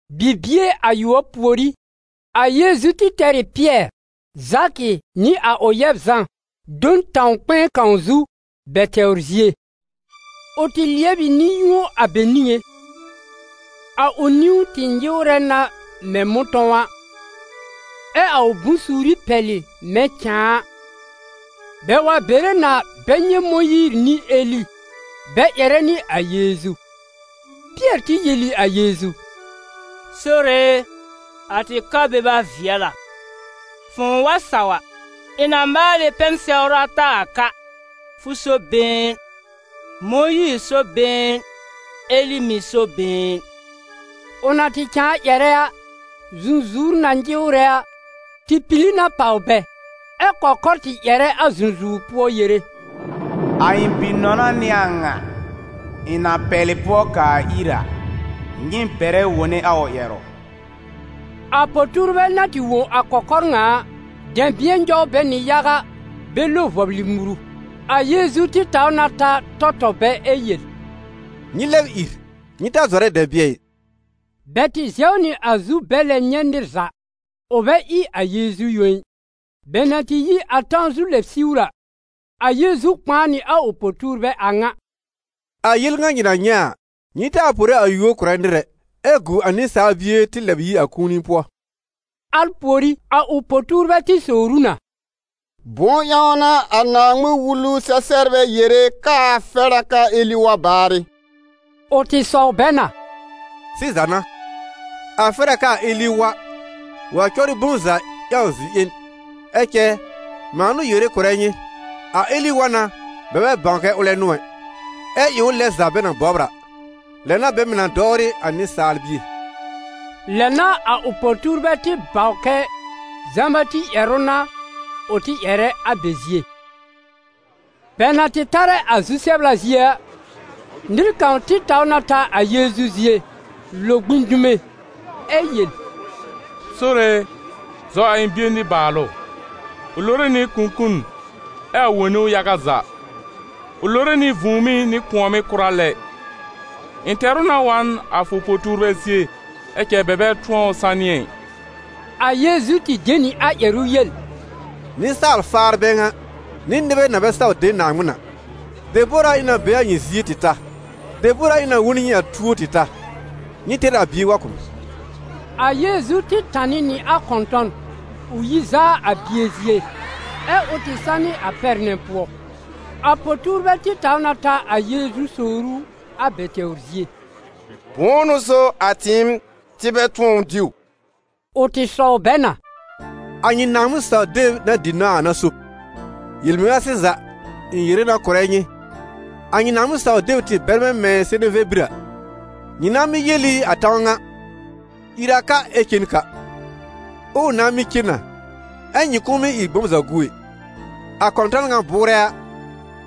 Bibie ayʋɔb pùorí, a Yeezu tɩ tɛr ɩ Pɩɛr, Zakɩ nɩ a ʋ yɛb Zã do n tãw kpɛ̃ɛ kãw zu, bɛ tɛwr zie. Ʋ tɩ lɩɛb ɩ nɩ-yũo a bɛ niŋé; a ʋ niwn tɩ nyɩwrɛ na mɛ̃ mʋ̃tɔ̃w a, ɛ a ʋ bʋ̃-suuri pɛlɩ mɛ̃ cãa a. Bɛ wa bere na bɛ nyɛ̃ Mõyiir nɩ Eli bɛ ƴɛrɛ nɩ a Yeezu. Pɩɛr tɩ yel ɩ a Yeezu: «Sore e, a tɩ ka beba vɩɛl a; fʋ̃ʋ wa saw a, ɩ̃ na maal ɩ pɛn-sɛwr ata a ka, fʋ so been, Mõyiir so been, Eli mɩ̀ so been.» Ʋ na tɩ cãa ƴɛrɛ a, zũzuwr na nyɩwrɛ a, tɩ pili na pàw bɛ, ɛ kɔkɔr tɩ ƴɛrɛ a zũzuwr pʋɔ yere: «A ɩ̃ Bi-nɔna n'ɩ a ŋa, ɩ̃ na pɛlɩ pʋɔ kaa ir a, nyɩ bɛrɛ wone a ʋ ƴɛrʋ.» A po-tuurbɛ na tɩ wõ a kɔkɔr ŋa a, dɛ̃bɩ̃ɛ nyɔw bɛ nɩ yaga bɛ lo vɔblɩ muru. A Yeezu tɩ taw na ta tɔ tɔ bɛ ɛ yel: «Nyɩ lɛb ìr, nyɩ ta zɔrɛ dɛ̃bɩ̃ɛ ɩ!» Bɛ tɩ zɛw nɩ a zu bɛ lɛb nyɛ̃ nɩr za, ʋ bɛ ɩ a Yeezu yõ ɩ. Bɛ na tɩ yi a tãw zu lɛb siwr a, a Yeezu kpãa nɩ a ʋ po-tuurbɛ a ŋa: «A yel ŋa nyɩ na nyɛ̃ a, nyɩ taa pore a yúor kʋ̀rɛ nɩr ɛ, ɛ gu a Nɩsaal Bie tɩ lɛb yi a kũuni pʋɔ.» Al pùorí, a ʋ po-tuurbɛ tɩ sowr ʋ na: «Bʋ̃ʋ ƴãw n'a a Naaŋmɩn-Wulu-sɛ-sɛbrbɛ yere k'aa fɛr a kɛ a Eli wa baarɩ?» Ʋ tɩ sɔw bɛ na: «Sɩza n'a, a fɛr a k'aa Eli wa, wa cɔbrɩ bom za ƴãw zi-ƴẽn. Ɛ cɛ, mãa n'ʋ yere kʋ̀rɛ nyɩ, a Eli wa na bɛ bɛ bãw kɛ ʋlɛ n'ʋ ɛ, ɛ ɩ ʋ lɛn za bɛ na bɔbr a; lɛ n'a bɛ mɩ̀ na dɔwrɩ a Nɩsaal Bie.» Lɛ n'a a ʋ po-tuurbɛ tɩ bãw kɛ Zã-Bati ƴɛrʋ n'a ʋ tɩ ƴɛrɛ a bɛ zie. Bɛ na tɩ tarɛ a zu-sɛbla zie a, nɩr kãw tɩ taw na ta a Yeezu zie, lo gbĩ dume, ɛ yel: «Sore e, zɔ a ɩ̃ bie nɩbaalʋ. Ʋ lore nɩ kũkun ɛ a wone ʋ yaga za; ʋ lore nɩ vũùmí nɩ kʋ̃ɔ̀mɩ́ kʋra lɛ. Ɩ̃ tɛr ʋ na wa n a fʋ po-tuurbɛ zie, ɛ cɛ bɛ bɛ tʋ̃ɔ ʋ sanɩ ɛ.» A Yeezu tɩ de nɩ a ƴɛrʋ yel: «Nɩsaal-faar bɛ ŋa, nɩ nɩbɛ na bɛ saw de Naaŋmɩn a! Debor a ɩ̃ na be a nyɩ zie tɩ ta? Debor a ɩ̃ na wõ n nyɩ a tuo tɩ ta? Nyɩ tɛr a bie wa kʋ̀ m.» A Yeezu tɩ tanɩ nɩ a kɔ̃tɔn, ʋ yi zaa a bie zie, ɛ ʋ tɩ sanɩ a pɛr nɛ pʋɔ. A po-tuurbɛ tɩ taw na ta a Yeezu sowr ʋ a bɛ tɛwr zie: «Bʋ̃ʋ n'ʋ so a tɩɩm tɩ bɛ tʋ̃ɔ ʋ diw?» Ʋ tɩ sɔw bɛ na: «A nyɩ Naaŋmɩn-saw-deb na dɩ nãw a n'a so. Yel-mɩŋa sɩza ɩ̃ yere na kʋ̀rɛ nyɩ, a nyɩ Naaŋmɩn-saw-deb tɩ bɛrmɛ̃ mɛ̃ seneve bir a, nyɩ nãá mɩ́ yel ɩ a tãw ŋa: ‹Ìr a ka ɛ cen ka›, ɛ ʋ nãá mɩ́ cen na, ɛ nyɩ kʋ̃ʋ mɩ́ ɩ bom za gu ɛ. [ A kɔ̃tɔn ŋa bʋʋrɛ a,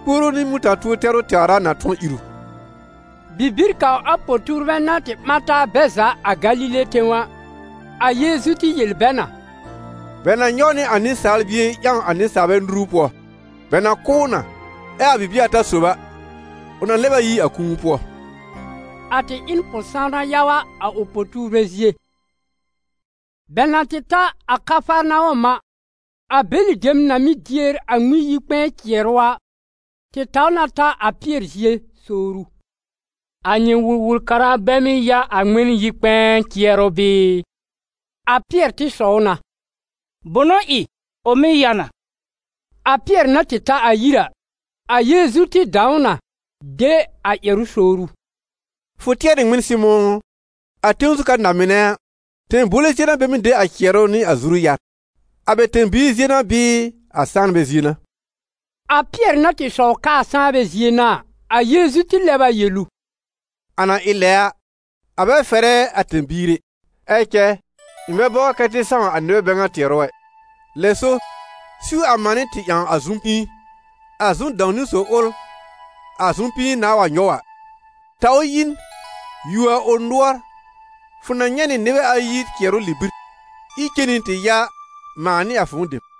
puoru nɩ muta-tuo tɛrʋ tɛwr a na tʋ̃ɔ ír ʋ.»] Bibir kãw a po-tuurbɛ na tɩ ɓã taa bɛ za a Galile tẽw a, a Yeezu tɩ yel bɛ na: «Bɛ na nyɔw nɩ a Nɩsaal Bie ƴãw a nɩsaalbɛ nuru pʋɔ; bɛ na kʋ́ ʋ na, ɛ a bibie ata sob a, ʋ na lɛb a yi a kũu pʋɔ.» A tɩ ɩ n pʋ-sãwna yaga a ʋ po-tuurbɛ zie. Bɛ na tɩ ta a Kafarnawɔm a, a bɛlɩ dem na mɩ́ dier a Ŋmɩn-yi-kpɛ̃ɛ cɩɛrʋ a, tɩ taw na ta a Pɩɛr zie sowr ʋ: «A nyɩ Wul-wul-kara bɛ mɩ́ ya a Ŋmɩn-yi-kpɛ̃ɛ cɩɛrʋ bɩɩ?» A Pɩɛr tɩ sɔw na: «Bʋnʋ ɩ? Ʋ mɩ́ ya na.» A Pɩɛr na tɩ ta a yir a, a Yeezu tɩ dãw ʋ na de a ƴɛrʋ sowr ʋ: «Fʋ tɩɛr ɩ ŋmɩn, Sɩmʋ̃ ʋ? A tẽw zu ka na-mɩnɛ a, tẽbowle zie n'a bɛ mɩ́ de a cɩɛrʋ nɩ a zuru-yar? A bɛ tẽ-biir zie n'a bɩɩ a sãanbɛ zie n'a?» A Pɩɛr na tɩ sɔw k'aa sãanbɛ zie n'a a, a Yeezu tɩ lɛb a yel ʋ: «A na ɩ lɛ a, a bɛ fɛrɛ a tẽ-biir ɛ. Ɛ cɛ ɩ̃ bɛ bɔbr kɛ tɩ sãw a nɩbɛ bɛ ŋa tɩɛrʋ ɛ; lɛ so, siw a manɩ́ tɩ ƴãw a zʋm-pĩi. A zʋm-dãw-niwn sob ʋl a zʋm-pĩi nãà wa nyɔw a, taw ʋ yi n, yuo a ʋ nʋɔr, fʋ na nyɛ̃ nɩ nɩbɛ ayi cɩɛrʋ libir, ír cen nɩ tɩ ya mãa nɩ a fʋ̃ʋ dem.»